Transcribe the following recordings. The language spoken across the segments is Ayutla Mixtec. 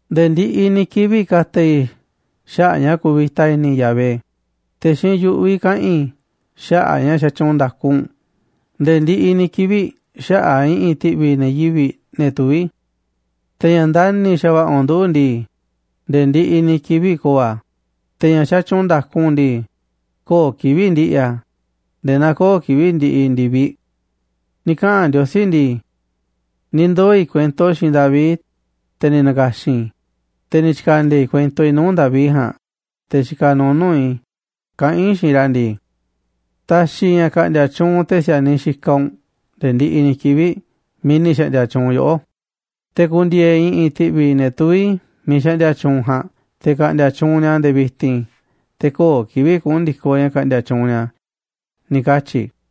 Nde̱e̱ ndiꞌiꞌ ni̱ kivi̱ꞌ ka̱ta̱ i̱ xaꞌa̱ꞌ ña̱ kuvita i̱ni̱ Yahvé, te̱ xiinꞌ yu̱ꞌuꞌ i̱ kaꞌa̱n i̱ xaꞌa̱ꞌ ña̱ xatyuunꞌ nda̱ku u̱nꞌ nde̱e̱ ndiꞌiꞌ ni̱ kivi̱ꞌ xaꞌa̱ꞌ i̱ꞌi̱n ti̱ꞌvi̱ ne̱ yivi̱ꞌ, ne̱ tuví. Te̱ ña̱ ndani̱ xa̱va̱ꞌa̱ u̱nꞌ nduꞌu̱ ndii, nde̱e̱ ndiꞌiꞌ ni̱ kivi̱ꞌ ko̱o̱ a̱, te̱ ña̱ xatyuunꞌ nda̱ku u̱nꞌ ndii, köo̱ꞌ kivi̱ꞌ ndi̱ꞌi̱ a̱ nde̱e̱ naa köo̱ꞌ kivi̱ꞌ ndiꞌiꞌ ndi̱viꞌ. Ni̱ kaꞌa̱n Ndiosí ndii: “Ni̱ ndoo̱ i̱ kuento xiinꞌ David, te̱ ni̱ na̱ka̱xi̱n i̱, te̱ ni̱ tyi̱ka̱ndi̱a̱ i̱ kuento i̱ nuu̱ꞌ David ja̱a̱nꞌ, te̱ xikaꞌ nuuꞌ nuu̱ꞌ i̱, kaꞌán i̱ xiinꞌ ra̱ ndii: ‘Ta̱xi̱ i̱ ña̱ ka̱ꞌndi̱a̱ tyuunꞌ te̱ si̱a̱niꞌ xikaꞌ u̱nꞌ nde̱e̱ ndiꞌiꞌ ni̱ kivi̱ꞌ miiꞌ ni̱ xa̱ꞌndi̱a̱ tyuunꞌ yoꞌó, te̱ ku̱ndi̱e̱e̱ i̱ꞌi̱n ti̱ꞌvi̱ ne̱ tuví miiꞌ xaꞌndia tyuunꞌ u̱nꞌ ja̱a̱nꞌ te̱ ka̱ꞌndi̱a̱ tyuunꞌ ni̱a̱ nde̱e̱ vi̱ti̱n, te̱ köo̱ꞌ kivi̱ꞌ kuꞌu̱n ndi̱koꞌ ña̱ ka̱ꞌndi̱a̱ tyuunꞌ ni̱a̱,’ ni̱ katyi̱ i̱.’”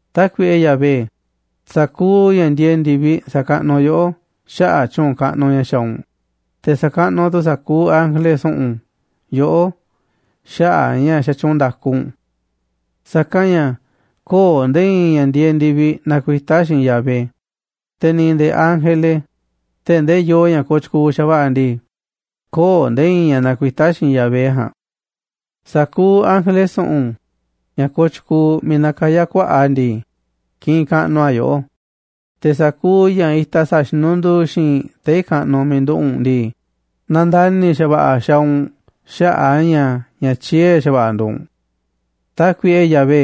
Tákuiꞌe Yahvé, sa̱kuuꞌ ña̱ ndieeꞌ ndi̱viꞌ sa̱kaꞌnuꞌ yoꞌó xaꞌa̱ꞌ tyu̱u̱n kaꞌnuꞌ ña̱ xaaꞌ u̱nꞌ, te̱ sa̱kaꞌnuꞌ tu̱ sa̱kuuꞌ ángele su̱ꞌu̱n yoꞌó xaꞌa̱ꞌ a̱ ña̱ xatyuunꞌ nda̱ku u̱nꞌ. Sa̱kanꞌ ña̱ köo̱ꞌ nde̱e̱ i̱i̱n ña̱ ndieeꞌ ndi̱viꞌ nakuitá xiinꞌ Yahvé, te̱ ni̱ nde̱e̱ ángele, tee̱ꞌ ndee yoo ña̱ kooꞌ tyukuuꞌ xa̱va̱ꞌa̱ a̱ ndii, köo̱ꞌ nde̱e̱ i̱i̱n a̱ nakuitá xiinꞌ Yahvé ja̱a̱nꞌ. Sa̱kuuꞌ ángele su̱ꞌu̱n ña̱ kooꞌ tyukuuꞌ miiꞌ nakayá kuaꞌa̱ꞌ a̱ ndii, kiꞌinꞌ kaꞌnuꞌ a̱ yoꞌó, te̱ sa̱kuuꞌ ña̱ itaꞌ sa̱a̱ xinundu̱u̱ xi̱i̱nꞌ tei̱ kaꞌnuꞌ miiꞌ nduꞌu̱ꞌ u̱nꞌ ndii, nandani̱ xa̱va̱ꞌa̱ a̱ xaaꞌ u̱nꞌ xaꞌa̱ꞌ a̱ ña̱ ña̱ tyiee̱ xa̱va̱ꞌa̱ nduuꞌ u̱nꞌ. Tákuiꞌe Yahvé,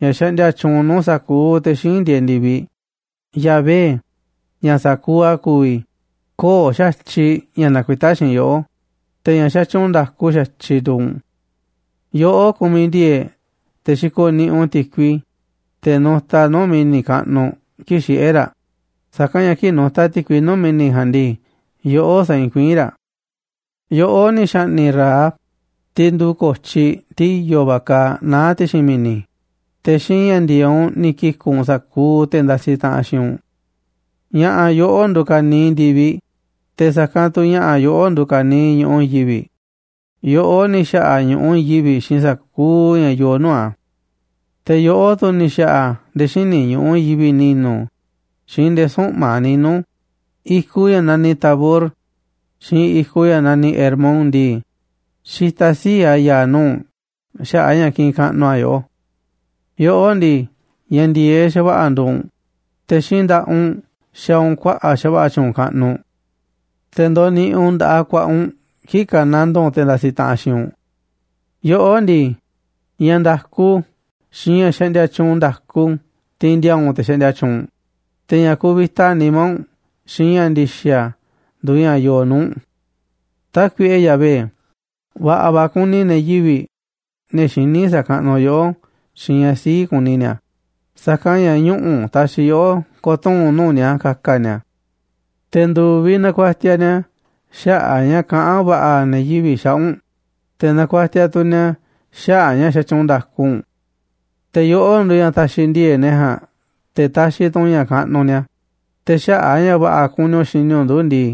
ña̱ xaꞌndia tyuunꞌ nuu̱ꞌ sa̱kuuꞌ te̱ xíinꞌ ndieeꞌ ndi̱viꞌ, Yahvé, ña̱ sa̱kuuꞌ a̱ ku̱vi̱, köo̱ꞌ xa̱tyiꞌ ña̱ nakuitá xiinꞌ yoꞌó, te̱ ña̱ xatyuunꞌ nda̱ku xa̱tyiꞌ nduuꞌ u̱nꞌ. Yoꞌó kumiꞌ ndi̱e̱e̱ꞌ te̱ xikoꞌ niꞌiꞌ u̱nꞌ ti̱kui, teꞌ nutaꞌ nuu̱ꞌ mi̱ni̱ kaꞌnuꞌ kii̱ꞌ xiꞌé raꞌ, sa̱kanꞌ ña̱ kii̱ꞌ nutaꞌ ti̱kui nuu̱ꞌ mi̱ni̱ ja̱a̱nꞌ ndii, yoꞌó saiin kuiín raꞌ. Yoꞌó ni̱ xa̱ꞌni̱ꞌ Rahab, tiꞌ nduuꞌ ko̱tyiꞌ, tiꞌ i̱yo̱ va̱ kaaꞌ naá ti̱xi̱n mi̱ni̱, te̱ xiinꞌ ña̱ ndi̱e̱eꞌ u̱nꞌ ni̱ ki̱ku̱ꞌ u̱nꞌ sa̱kuuꞌ te̱ ndasiꞌ taꞌanꞌ xiinꞌ u̱nꞌ. Ña̱ꞌa̱ yoꞌó nduuꞌ ka̱niiꞌ ndi̱viꞌ, te̱ sa̱kanꞌ tu̱ ña̱ꞌa̱ yoꞌó nduuꞌ ka̱niiꞌ ñu̱ꞌuꞌ i̱i̱n yivi̱ꞌ, yoꞌó ni̱ xa̱ꞌa̱ ñu̱ꞌuꞌ i̱i̱n yivi̱ꞌ xiinꞌ sa̱kuuꞌ ña̱ yoo nuu̱ꞌ a̱. Te̱ yoꞌó tu̱ ni̱ xa̱ꞌa̱ nde̱e̱ xíniꞌ ñu̱ꞌuꞌ i̱i̱n yivi̱ꞌ ni̱nu̱ xiinꞌ nde̱e̱ suꞌma̱ꞌ a̱ ninu̱, i̱kuꞌ ña̱ naniꞌ Tabor xiinꞌ i̱kuꞌ ña̱ naniꞌ Hermón ndii, xitaꞌ sii̱ꞌ a̱ ya̱a̱ nuu̱ꞌ u̱nꞌ xaꞌa̱ꞌ a̱ ña̱ kiꞌinꞌ kaꞌnuꞌ a̱ yoꞌó. Yoꞌó ndii, ña̱ ndi̱e̱eꞌ xa̱va̱ꞌa̱ nduuꞌ u̱nꞌ, te̱ xiinꞌ nda̱ꞌaꞌ u̱nꞌ xaaꞌ u̱nꞌ kuaꞌa̱ꞌ xa̱va̱ꞌa̱ tyu̱u̱n kaꞌnuꞌ, te̱ ndoniꞌiꞌ u̱nꞌ nda̱ꞌaꞌ ku̱a̱ꞌa̱ u̱nꞌ kii̱ꞌ kanandoo u̱nꞌ te̱ ndasiꞌ taꞌanꞌ xiinꞌ u̱nꞌ. Yoꞌó ndii, ña̱ nda̱ku xiinꞌ ña̱ xaꞌndia tyuunꞌ nda̱ku tiinꞌ ndiaa u̱nꞌ, te̱ xaꞌndia tyuunꞌ u̱nꞌ, te̱ ña̱ kuvita nimá u̱nꞌ xiinꞌ ña̱ ndi̱xa̱ nduuꞌ ña̱ yoo nuu̱ꞌ u̱nꞌ. Tákuiꞌe Yahvé, va̱ꞌa̱ va̱ kuni ne̱ yivi̱ꞌ, ne̱ xiní sakaꞌnuꞌ yoꞌó xiinꞌ ña̱ sii̱ꞌ kuni ni̱a̱, sa̱kanꞌ ña̱ ñuꞌu̱ taxiꞌ yoꞌó ko̱tuu̱n nuu̱ꞌ ni̱a̱ ka̱ka̱ ni̱a̱. Te̱ ndu̱viꞌ nakuatiaꞌ ni̱a̱ xaꞌa̱ꞌ ña̱ kaꞌán va̱ꞌa̱ ne̱ yivi̱ꞌ xaꞌa̱ꞌ u̱nꞌ, te̱ nakuatiaꞌ tu̱ ni̱a̱ xaꞌa̱ꞌ ña̱ xatyuunꞌ nda̱ku u̱nꞌ. Te̱ yoꞌó nduuꞌ ña̱ taxiꞌ ndi̱e̱e̱ꞌ ne̱ ja̱a̱nꞌ, te̱ taxiꞌ tu̱ u̱nꞌ ña̱ kaꞌnuꞌ ni̱a̱, te̱ xaꞌa̱ꞌ a̱ ña̱ va̱ꞌa̱ kuni u̱nꞌ xini u̱nꞌ ndu̱ ndii,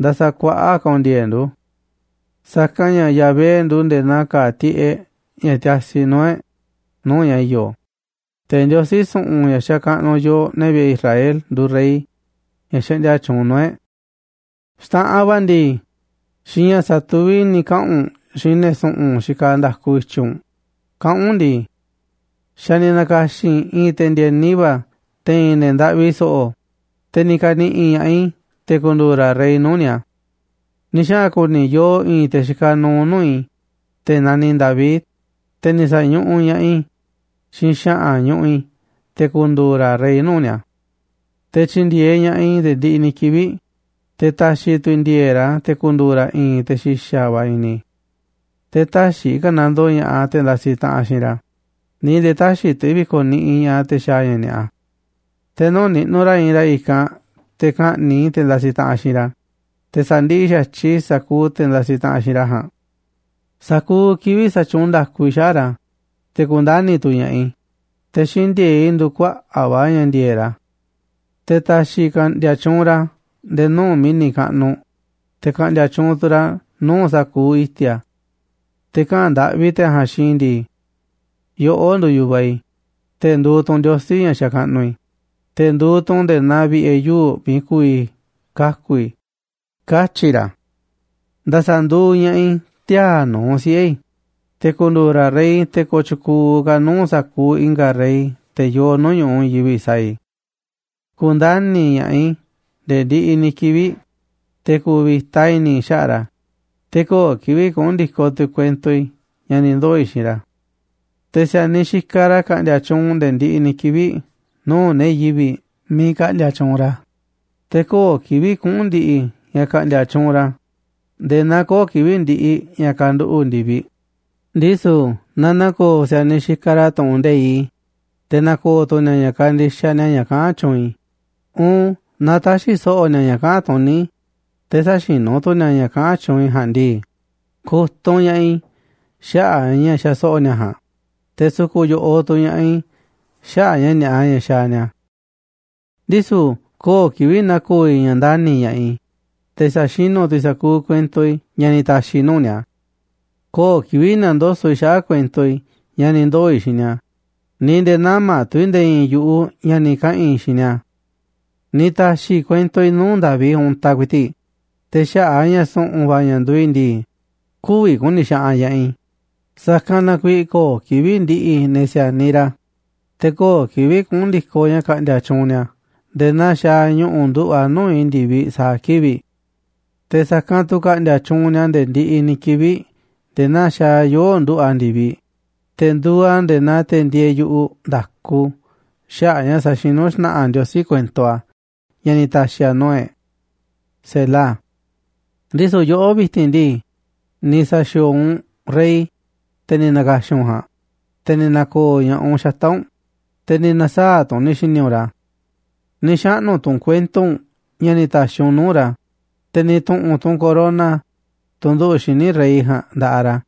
nda̱sa̱ kuaꞌa̱ꞌ ka̱ u̱nꞌ ndi̱e̱e̱ꞌ ndu̱. Sa̱kanꞌ ña̱ Yahvé nduuꞌ nde̱e̱ naa ka̱a̱ tiꞌeꞌ ña̱ tiasi nuu̱ꞌ e̱ꞌ nuu̱ꞌ ña̱ i̱yo̱, te̱ Ndiosí su̱ꞌu̱n, ña̱ xakaꞌnuꞌ yooꞌ, ne̱ vi̱ꞌe̱ Israel, nduuꞌ rey ña̱ xaꞌndia tyuunꞌ nuu̱ꞌ e̱ꞌ. Xta̱ꞌanꞌ va̱ ndii, xiinꞌ i̱i̱n ña̱ satuví ni̱ kaꞌa̱n u̱nꞌ xiinꞌ ne̱ su̱ꞌu̱n xikaꞌ nda̱ku i̱tyiꞌ u̱nꞌ, kaꞌán u̱nꞌ ndii: “Xa̱ ni̱ na̱ka̱xi̱n i̱ i̱i̱n te̱ ndi̱e̱ni va̱ te̱i̱n ne̱ ndaꞌvi so̱ꞌo̱, te̱ ni̱ ka̱ni̱ꞌi̱ ña̱ꞌaꞌ i̱ te̱ ku̱ndu̱u̱ ra̱ rey nuu̱ꞌ ni̱a̱. Ni̱ xaꞌa̱n ku̱ni̱ i̱ yoo i̱i̱n te̱ xikaꞌ nuuꞌ nuu̱ꞌ i̱, te̱ naniꞌ David, te̱ ni̱ sa̱ñuꞌuꞌ ña̱ꞌaꞌ i̱ xiinꞌ xa̱ꞌa̱n ñuꞌuꞌ i̱, te̱ ku̱ndu̱u̱ ra̱ rey nuu̱ꞌ ni̱a̱. Te̱ tyi̱ndi̱e̱eꞌ ña̱ꞌaꞌ i̱ nde̱e̱ ndiꞌiꞌ ni̱ kivi̱ꞌ, te̱ ta̱xi̱ tu̱ i̱ ndi̱e̱e̱ꞌ ra̱ te̱ ku̱ndu̱u̱ ra̱ i̱i̱n te̱ xi̱xa̱ va̱ i̱ni̱. Te̱ tä̱xi̱ i̱ ka̱nandoo ña̱ꞌaꞌ te̱ ndasiꞌ taꞌanꞌ xiinꞌ ra̱, ni̱ nde̱e̱ tä̱xi̱ tu̱ i̱ vi̱ko̱niꞌiꞌ ña̱ꞌaꞌ te̱ xaaꞌ ña̱ ni̱a̱ꞌa. Te̱ nuu̱ꞌ niꞌnuꞌ ra̱ iinꞌ ra̱ i̱kanꞌ te̱ ka̱ꞌni̱ꞌ i̱ te̱ ndasiꞌ taꞌanꞌ xiinꞌ ra̱, te̱ sa̱ndiꞌiꞌ xa̱tyiꞌ i̱ sa̱kuuꞌ te̱ ndasiꞌ taꞌanꞌ xiinꞌ ra̱ ja̱a̱nꞌ. Sa̱kuuꞌ kivi̱ꞌ sa̱tyuunꞌ nda̱ku i̱ xaꞌa̱ꞌ ra̱, te̱ ku̱ndani̱ tu̱ ña̱ꞌaꞌ i̱, te̱ xiinꞌ ndi̱e̱e̱ꞌ i̱ ndu̱kuaꞌa̱ꞌ va̱ ña̱ ndi̱e̱eꞌ ra̱. Te̱ ta̱xi̱ i̱ ka̱ꞌndi̱a̱ tyuunꞌ ra̱ nde̱e̱ nuu̱ꞌ mi̱ni̱ kaꞌnuꞌ, te̱ ka̱ꞌndi̱a̱ tyuunꞌ tu̱ ra̱ nuu̱ꞌ sa̱kuuꞌ i̱ti̱a̱. Te̱ kaꞌa̱n ndaꞌvi te̱ ja̱a̱nꞌ xiinꞌ i̱ ndii: ‘Yoꞌó nduuꞌ yu̱vaꞌ i̱, te̱ nduuꞌ tu̱ u̱nꞌ Ndiosí ña̱ xakaꞌnuꞌ i̱, te̱ nduuꞌ tu̱ u̱nꞌ nde̱e̱ naa vi̱ꞌe̱ yuu̱ꞌ miiꞌ ku̱vi̱ ku̱vi̱ kaku̱ i̱’, katyi̱ ra̱. Nda̱sa̱ ndu̱u̱ ña̱ꞌaꞌ i̱ tiaa̱ nu̱uꞌ siꞌe̱ i̱, te̱ ku̱ndu̱u̱ ra̱ rey, te̱ kooꞌ tyukuuꞌ ka̱ nuu̱ꞌ sa̱kuuꞌ i̱nga̱ rey te̱ yoo nuu̱ꞌ ñu̱ꞌuꞌ i̱i̱n yivi̱ꞌ sa̱a̱ i̱. Ku̱ndani̱ ña̱ꞌaꞌ i̱ nde̱e̱ ndiꞌiꞌ ni̱ kivi̱ꞌ, te̱ ku̱vi̱ta i̱ni̱ i̱ xaꞌa̱ꞌ ra̱, te̱ köo̱ꞌ kivi̱ꞌ kuꞌu̱n ndi̱koꞌ tu̱ kuento i̱ ña̱ ni̱ ndoo̱ i̱ xiinꞌ ra̱. Te̱ si̱a̱niꞌ xikaꞌ ra̱ ka̱ꞌndi̱a̱ tyuunꞌ nde̱e̱ ndiꞌiꞌ ni̱ kivi̱ꞌ nuu̱ꞌ ne̱ yivi̱ꞌ miiꞌ ka̱ꞌndi̱a̱ tyuunꞌ ra̱, te̱ köo̱ꞌ kivi̱ꞌ kuꞌu̱n ndi̱ꞌi̱ ña̱ ka̱ꞌndi̱a̱ tyuunꞌ ra̱ nde̱e̱ naa köo̱ꞌ kivi̱ꞌ ndiꞌiꞌ ña̱ kanduꞌu̱ꞌ ndi̱viꞌ. Ndisu̱ naaꞌ na̱ko̱o̱ si̱a̱niꞌ xikaꞌ ra̱ tu̱ꞌu̱n nde̱iꞌ i̱, te̱ na̱ko̱o̱ tu̱ ni̱a̱ ña̱ kandixaꞌ ni̱a̱ ña̱ kaꞌán tyuunꞌ i̱, uun naaꞌ tä̱xi̱ so̱ꞌo̱ ni̱a̱ ña̱ kaꞌán tuní i̱, te̱ sä̱xinú tu̱ ni̱a̱ ña̱ kaꞌán tyuunꞌ i̱ ja̱a̱nꞌ ndii, ku̱tunꞌ ña̱ꞌaꞌ i̱ xaꞌa̱ꞌ ña̱ xa̱ so̱ꞌo̱ ni̱a̱ ja̱a̱nꞌ, te̱ su̱ku̱ꞌ yo̱ꞌoꞌ tu̱ ña̱ꞌaꞌ i̱ xaꞌa̱ꞌ ña̱ ni̱a̱ꞌa ña̱ xaaꞌ ni̱a̱. Ndisu̱ köo̱ꞌ kivi̱ꞌ na̱ko̱o̱ i̱ ña̱ ndani̱ ña̱ꞌaꞌ i̱, te̱ sa̱xinú tu̱ i̱ sa̱kuuꞌ kuento i̱ ña̱ ni̱ ta̱xi̱ i̱ nuu̱ꞌ ni̱a̱. Köo̱ꞌ kivi̱ꞌ na̱ndoso̱ꞌ i̱ xaꞌa̱ꞌ kuento i̱ ña̱ ni̱ ndoo̱ i̱ xiinꞌ ni̱a̱, ni̱ nde̱e̱ nä̱ma̱ tu̱ i̱ nde̱e̱ i̱i̱n yu̱ꞌuꞌ ña̱ ni̱ kaꞌa̱n i̱ xiinꞌ ni̱a̱. Ni̱ ta̱xi̱ i̱ kuento i̱ nuu̱ꞌ David untaꞌ ku̱i̱ti̱ꞌ, te̱ xaꞌa̱ꞌ a̱ ña̱ su̱ꞌu̱n va̱ ña̱ nduuꞌ i̱ ndii, kü̱vi̱ ku̱ni̱ xaꞌanꞌ ña̱ꞌaꞌ i̱. Sa̱kanꞌ na kuiiꞌ köo̱ꞌ kivi̱ꞌ ndi̱ꞌi̱ ne̱ si̱a̱niꞌ ra̱, te̱ köo̱ꞌ kivi̱ꞌ kuꞌu̱n ndi̱koꞌ ña̱ ka̱ꞌndi̱a̱ tyuunꞌ ni̱a̱ nde̱e̱ naa xaaꞌ ñu̱ꞌu̱ nduꞌu̱ꞌ a̱ nuu̱ꞌ i̱ ndi̱viꞌ sa̱a̱ kivi̱ꞌ. Te̱ sa̱kanꞌ tu̱ ka̱ꞌndi̱a̱ tyuunꞌ ni̱a̱ nde̱e̱ ndiꞌiꞌ ni̱ kivi̱ꞌ nde̱e̱ naa xaaꞌ yoo̱ꞌ nduꞌu̱ꞌ a̱ ndi̱viꞌ, te̱ nduuꞌ a̱ nde̱e̱ naa te̱ ndieeꞌ yu̱ꞌuꞌ nda̱ku xaꞌa̱ꞌ ña̱ saxinú xna̱ꞌa̱ Ndiosí kuento a̱ ña̱ ni̱ ta̱xi̱ a̱ nuu̱ꞌ e̱ꞌ.” Ndisu̱ yoꞌó vi̱ti̱n ndii, ni̱ sa̱xi̱o̱o̱ u̱nꞌ rey, te̱ ni̱ na̱ka̱xi̱n u̱nꞌ ja̱a̱nꞌ, te̱ ni̱ na̱ko̱o̱ ña̱ꞌaꞌ u̱nꞌ xata̱ꞌ u̱nꞌ, te̱ ni̱ na̱saa̱ꞌ tu̱ u̱nꞌ ni̱ xi̱ni̱ u̱nꞌ ra̱. Ni̱ xaꞌnu̱ tu̱ u̱nꞌ kuento u̱nꞌ ña̱ ni̱ ta̱xi̱ u̱nꞌ nuu̱ꞌ ra̱, te̱ ni̱ tu̱ꞌu̱n tu̱ u̱nꞌ corona, tunꞌ nduꞌu̱ꞌ xíniꞌ rey ja̱a̱nꞌ, nda̱ꞌaꞌ ra̱,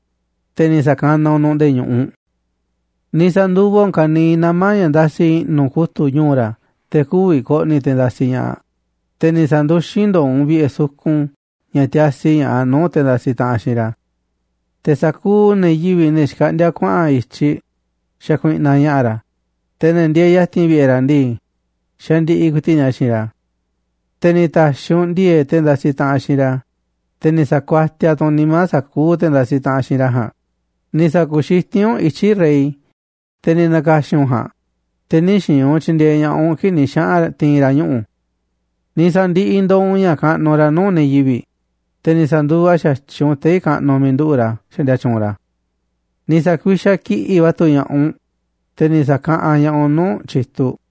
te̱ ni̱ sa̱kanaꞌ u̱nꞌ nu̱ꞌ nde̱e̱ ñu̱ꞌuꞌ. Ni̱ sa̱nduva u̱nꞌ ka̱niiꞌ nama̱ ña̱ ndasi i̱ꞌnu̱ kutu̱ꞌ ñu̱u̱ ra̱ te̱ kü̱vi̱ ko̱ꞌni̱ te̱ ndasiꞌ ña̱ꞌaꞌ, te̱ ni̱ sa̱nduxín ndo̱o̱ u̱nꞌ vi̱ꞌe̱ sukun ña̱ tiasi ña̱ꞌaꞌ nuu̱ꞌ te̱ ndasiꞌ taꞌanꞌ xiinꞌ ra̱. Te̱ sa̱kuuꞌ ne̱ yivi̱ꞌ, ne̱ xkaꞌndíá kuaꞌa̱n i̱tyiꞌ, xakuiꞌnaꞌ ña̱ꞌa̱ ra̱, te̱ ne̱ ndieeꞌ ya̱ti̱n vi̱ꞌe̱ ra̱ ndii, xandiꞌiꞌ ku̱i̱ti̱ꞌ ni̱a̱ xiinꞌ ra̱. Te̱ ni̱ ta̱xi̱ u̱nꞌ ndi̱e̱e̱ꞌ te̱ ndasiꞌ taꞌanꞌ xiinꞌ ra̱, te̱ ni̱ sa̱kuatiaꞌ tu̱ u̱nꞌ nimá sa̱kuuꞌ te̱ ndasiꞌ taꞌanꞌ xiinꞌ ra̱ ja̱a̱nꞌ. Ni̱ sa̱ku̱xitín u̱nꞌ ityi̱ rey, te̱ ni̱ na̱ka̱xi̱n u̱nꞌ ja̱a̱nꞌ, te̱ nï̱ xi̱i̱n u̱nꞌ tyi̱ndi̱e̱eꞌ ña̱ꞌaꞌ u̱nꞌ kii̱ꞌ ni̱ xaꞌa̱n ti̱i̱n ra̱ ñuꞌu̱. Ni̱ sa̱ndiꞌiꞌ ndo̱o̱ u̱nꞌ ña̱ kaꞌnuꞌ ra̱ nuu̱ꞌ ne̱ yivi̱ꞌ, te̱ ni̱ sa̱nduva xa̱tyiꞌ u̱nꞌ tei̱ kaꞌnuꞌ miiꞌ nduꞌu̱ꞌ ra̱ xaꞌndia tyuunꞌ ra̱. Ni̱ sa̱kuixaꞌ kiꞌi̱ꞌ va̱ tu̱ ña̱ꞌaꞌ u̱nꞌ, te̱ ni̱ sa̱kaꞌanꞌ ña̱ꞌaꞌ u̱nꞌ nuu̱ꞌ tyituꞌ.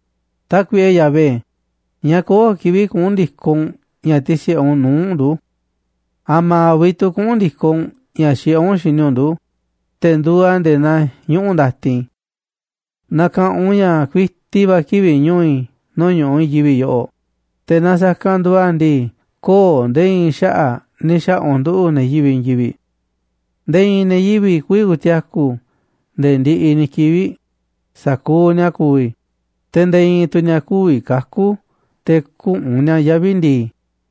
Tákuiꞌe Yahvé, ¿ñáá köo̱ꞌ kivi̱ꞌ kuꞌu̱n ndi̱koꞌ u̱nꞌ ña̱ tisi̱ꞌe u̱nꞌ nuu̱ꞌ ndu̱? ¿A̱ma̱ vi̱ꞌ tu̱ kuꞌu̱n ndi̱koꞌ u̱nꞌ ña̱ xiꞌé u̱nꞌ xini u̱nꞌ ndu̱, te̱ nduuꞌ a̱ nde̱e̱ naa ñuꞌu̱ ndatin? Na̱ka̱ꞌanꞌ u̱nꞌ ña̱ kuiti va̱ kivi̱ꞌ ñu̱u̱ i̱ nuu̱ꞌ ñu̱ꞌuꞌ i̱i̱n yivi̱ꞌ yoꞌoꞌ, te̱ naaꞌ sa̱kanꞌ nduuꞌ a̱ ndii, köo̱ꞌ nde̱e̱ i̱i̱n xaꞌa̱ꞌ ni̱ xa̱ꞌa̱ u̱nꞌ nduꞌu̱ ne̱ yivi̱ꞌ i̱i̱n yivi̱ꞌ. Nde̱e̱ i̱i̱n ne̱ yivi̱ꞌ kü̱vi̱ ku̱ti̱a̱ku̱ nde̱e̱ ndiꞌiꞌ ni̱ kivi̱ꞌ, sa̱kuuꞌ ni̱a̱ ku̱vi̱, te̱ nde̱e̱ i̱i̱n tu̱ ni̱a̱ kü̱vi̱ kaku̱, te̱ küꞌu̱n ni̱a̱ yavi̱ ndi̱i̱.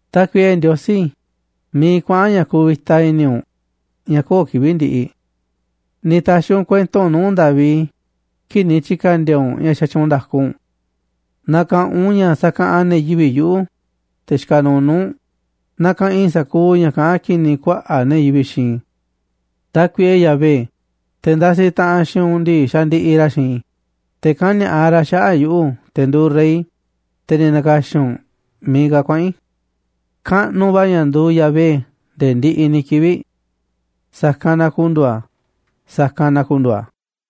Tákuiꞌe Ndiosí, ¿miiꞌ kuaꞌa̱n ña̱ kuvita i̱ni̱ u̱nꞌ ña̱ köo̱ꞌ kivi̱ꞌ ndiꞌiꞌ? Ni̱ ta̱xi̱ u̱nꞌ kuento u̱nꞌ nuu̱ꞌ David kii̱ꞌ ni̱ tyi̱ka̱ndi̱a̱ u̱nꞌ ña̱ xatyuunꞌ nda̱ku u̱nꞌ. Na̱ka̱ꞌanꞌ u̱nꞌ ña̱ sa̱kaꞌanꞌ ne̱ yivi̱ꞌ yuꞌu̱, te̱ xikaꞌ nuuꞌ nuu̱ꞌ u̱nꞌ, nakaꞌanꞌ i̱ sa̱kuuꞌ ña̱ kaꞌán ki̱ni̱ kuaꞌa̱ꞌ ne̱ yivi̱ꞌ xiinꞌ i̱. Tákuiꞌe Yahvé, te̱ ndasiꞌ taꞌanꞌ xiinꞌ u̱nꞌ ndii, xandiꞌiꞌ ra̱ xiinꞌ i̱, te̱ kani̱a̱ꞌa ra̱ xaꞌa̱ꞌ yuꞌu̱, te̱ nduuꞌ rey, te̱ ni̱ na̱ka̱xi̱n u̱nꞌ miiꞌ ka̱ kuaꞌa̱n i̱. Kaꞌnuꞌ va̱ ña̱ nduuꞌ Yahvé nde̱e̱ ndiꞌiꞌ ni̱ kivi̱ꞌ. Sa̱kanꞌ na ku̱ndu̱u̱ a̱, sa̱kanꞌ na ku̱ndu̱u̱ a̱.